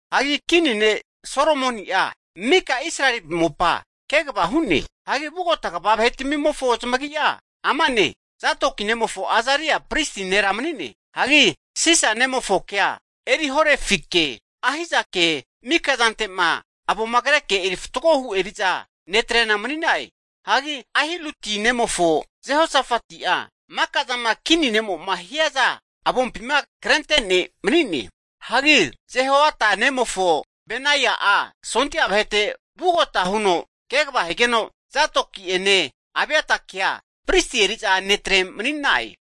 Hagi kini ne' Solomoni'a mika Israeli mopa kegava hu'ne. Hagi vugota kva vahetamimofo zamagi'a amane, Zadoki nemofo Azaria pristi nera mani'ne. Hagi Sisa nemofokea Erihorefike, Ahizakea mika zante'ma avoma kreke eri fatgohu eri'za netre'na mani'na'e. Hagi Ahiluti nemofo Jehosafati'a maka'zama kini ne'mo'ma hiazama avompima krenentea ne' mani'ne. Hagi Jehoiada nemofo Benaia'a sondia vahete vugagota huno kegava higeno, Zadoki'ene Abiatakea pristi eri'za netre mani'na'e.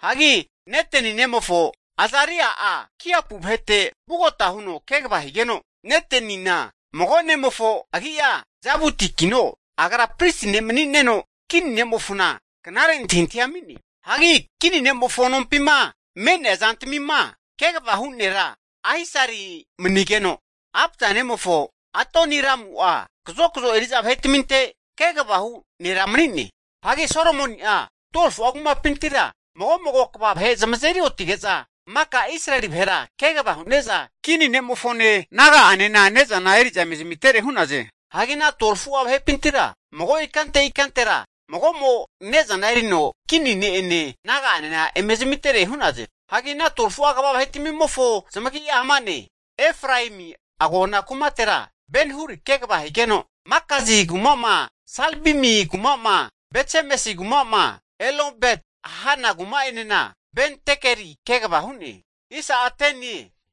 Hagi Neteni nemofo Azaria'a kiapu vahete vugota huno kegava higeno, Netenina mago nemofo agi'a Zabudikino, agra pristi ne' mani'neno kini ne'mofona knare antahintahia ami'ne. Hagi kini ne'mofo nompima me'nea zantamima kegavama hu nera Ahisari manigeno, Abda nemofo Adoniramu'a kazokazo eri'za vahetaminte kegava hu' nera mani'ne. Hagi Solomoni'a 12fu'a kumapintira mago'mago kva vahe zamazeri otige'za maka Israeli vahera kegava hu'neza kini ne'mofone, naga'anena ne'zana eri'za eme zamitere hu'naze. Hagi ana 12fu'a vahepintira mago ikante ikantera mago'mo ne'zana erino kini ne'ene naga'anena eme zamitere hu'naze. Hagi ana 12fu'a kva vahetmimofo zamagi'a ama'ne, Efraemi agona kukampi me'nea kumatera Ben-huri kegava higeno, Makazi kuma'ma, Salbimi kuma'ma, Betsemesi kuma'ma, Elonbet-hanan kuma'enena Ben-dekeri kegava hu'ne.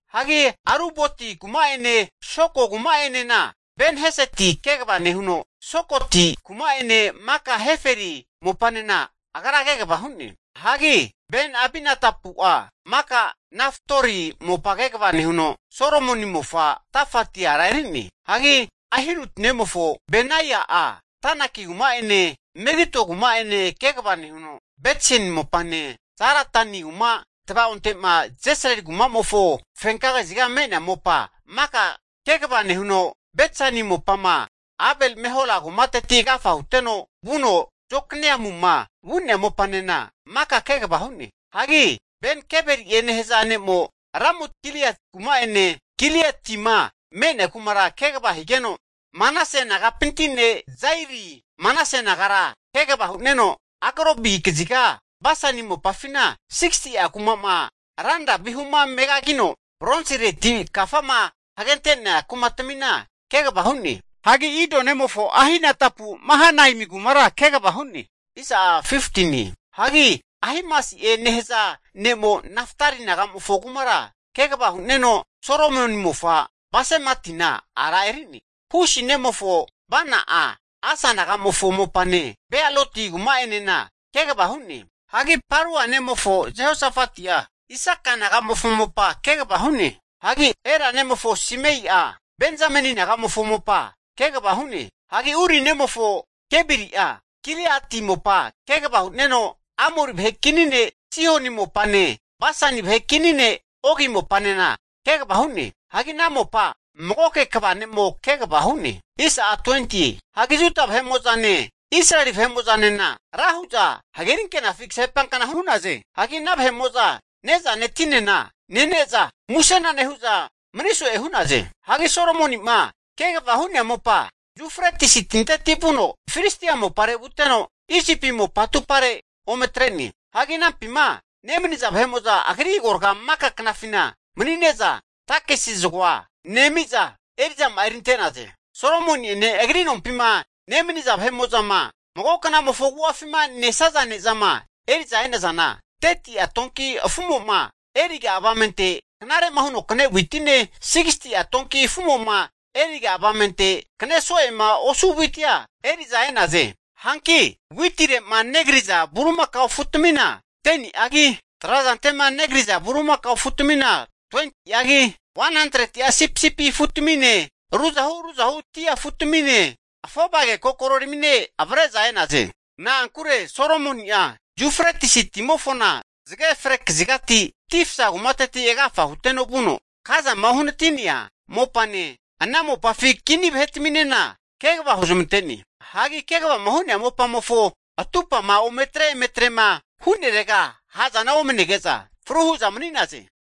Hagi Aruboti kuma'ene Soko kuma'enena Ben-heseti kegava nehuno, Sokoti kuma'ene maka Heferi mopanena agra kegava hu'ne. Hagi Ben-abinadapu'a maka Nafat-dori mopa kegava nehuno, Solomoni mofa Tafati ara eri'ne. Hagi Ahiludi nemofo Bana'a, Tanaki kuma'ene Megido kuma'ene kegava nehuno, Betsin mopane Zaretani kuma tavaonte'ma Jesrili kumamofo fenka kaziga me'nea mopa maka kegava nehuno, Betsani mopama Abel-mehola kumateti agafa huteno vuno Jokmeamuma vu'nea mopanena maka kegava hu'ne. Hagi Ben-geberi'e nehaza ne'mo Ramot-gilead kuma'ene Gilietima me'nea kumara kegava higeno, Manase nagapinti ne' Jairi Manase nagara kegava hu'neno, Argobi kaziga Basani mopafina 60'a kuma'ma ranra vihumo megagigeno Bronsireti kafama hagente'nea kumatmina kegava hu'ne. Hagi Ido nemofo Ahinadapu Mahanaimi kumara kegava hu'ne. Hagi Ahimasi'e nehaza ne'mo Naftali nagamofo kumara kegava hu'neno, (Solomoni mofa Basematina ara eri'ne.) Husi nemofo Bana'a Asa nagamofo mopane, Bealoti kuma'enena kegava hu'ne. Hagi Parua nemofo Jehosafati'a Isaka nagamofo mopa kegava hu'ne. Hagi Ela nemofo Simei'a, Benzameni naga'mofo mopa kegava hu'ne. Hagi Uri nemofo Gebari'a Giliati mopa kegava hu'neno, Amori vahe kini ne' Sihoni mopane, Basani vahe kini ne' Ogi mopanena kegava hu'ne. Hagi ana mopa magoke kva ne'mo kegava hu'ne. Hagi Juda vahe'ene, Israeli vahe'mo'zanena ra hu'za hageri ankenafi kasepankna hu'naze. Hagi ana vahe'mo'zane'zane tinena nene'za musena nehu'za mani so'e hu'naze. Hagi Solomoni'ma kegavama hu'nea mopa, Yufretis tinteti vuno Filistia mopare vuteno, Isipi mopa atupare ome atre'ne. Hagi anampima nemaniza vahe'mo'za agri agorga maka knafina mani'ne'za, takesi zagoa nemi'za, eri'zama'a erinte'naze. Solomoni'ene agri nompima nemaniza vahe'mo'zama mago knamofo agu'afima nesaza ne'zama eri'za e'nazana, 30'a donki afumo'ma eriga avamente knare'ma huno kane witine, 60'a donki afumo'ma eriga avamente kane so'ema hu'nea witia eri'za e'naze. Hanki witire'ma negriza bulimakao afutamina 10ni'agi, trazante'ma negriza bulimaka afutamina 20'agi, 100'a sipisipi afutamine ruzahu ruzahu dia afutamine, afovage kokoreramine avre'za e'naze. Na'ankure Solomoni'a Yufretisi timofona zage fre kaziga Tifsa kumateti agafa huteno vuno, Gazama uhanati'nea mopane, ana mopafi kini vahetaminena kegava huzmante'ne. Hagi kegavama hu'nea mopamofo atumpama ome atre eme atrema hu'nerega ha'zana omanege'za fru hu'za mani'naze.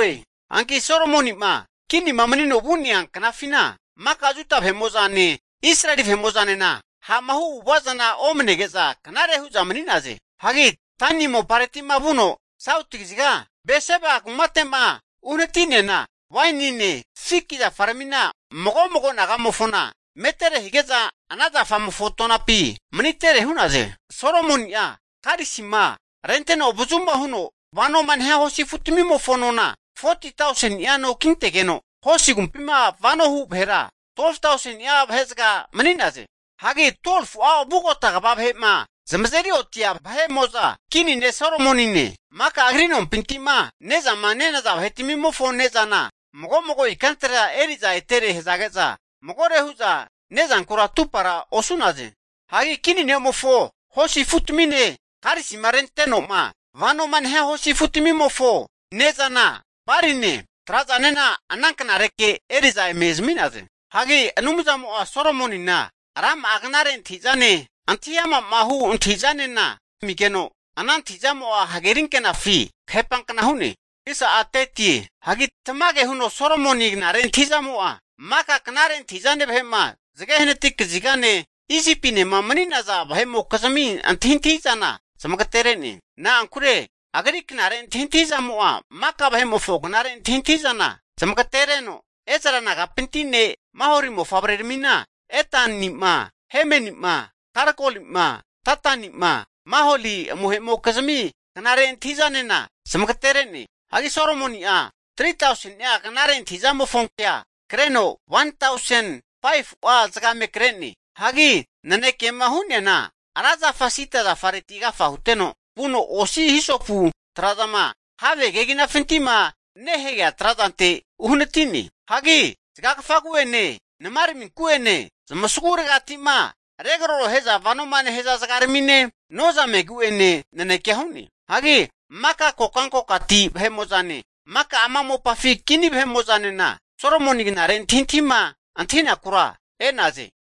Hanki Solomoni'ma kinima manino vu'nea knafina, maka Juda vahe'mo'zane Israeli vahe'mo'zanena ha'ma hu avu'ava zana omnege'za knare hu'za mani'naze. Hagi Dani mopareti'ma vuno, sauti kaziga Beseba kumate'ma uhanati'neana, wainine fiki zafaramina mago mago nagamofona metere hige'za ana zafamofo tonapi manitere hu'naze. Solomoni'a karisima renteno avazuma huno vanoma nehia hosi afutamimofo nona 40ti tauseni'a no kintegeno, hosi agumpima vano hu vahera 12tauseni'a vahezaga mani'naze. Hagi 12fu'a vugota kva vahe'ma zamazeri otia vahe'mo'za Kini ne' Solomonine, maka agri nompinti'ma ne'zama nenaza vahetmimofo ne'zana mago mago ikantera eri'za etere hazage'za magore hu'za ne'zankura atupara osu'naze. Hagi Kini ne'mofo hosi afutamine karisima rentenoma vanoma nehia hosi afutamimofo ne'zana baline, trazanena ana knareke eri'za eme zami'naze. Hagi Anumzamo'a Solomonina rama'a knare antahi'zane, antahiama'ma hu antahi'zanena amigeno, ana antahi'zamo'a hageri ankenafi kahepankna hu'ne. Hagi tamage huno Solomoni knare antahi'zamo'a, maka knare antahi'zane vahe'ma zage hanati kazigane, Isipinema mani'naza vahe'mokizmi antahintahi'zana zamagatere'ne. Na'ankure agri knare antahintahizamo'a maka vahe'mofo knare antahintahi'zana zamagatenereno, Ezra nagapinti ne' Maholi mofavreramina Etani'ma, Hemeni'ma, Kalkolima, Dadanima, Maholi amohe'mokizmi knare antahintahizanena zamagatere'ne. Hagi Solomoni'a 3tauseni'a knare antahizamofonkea kreno, 1tausen 5fu'a zagamera kre'ne. Hagi nanekema hu'neana ra zafa sida zafareti agafa huteno, vuno osi hisopu trazama have keginafintima nehagea trazante uhanati'ne. Hagi zagagafagu'ene namaraminku'ene zamasaguregati'ma regarorohe'za vanoma nehaza zagaramine, nozamegu'ene nanekea hu'ne. Hagi maka kokantegati vahe'mo'zane, maka ama mopafi kini vahe'mo'nena Solomoni knare antahintahima antahinakura agrite e'naze.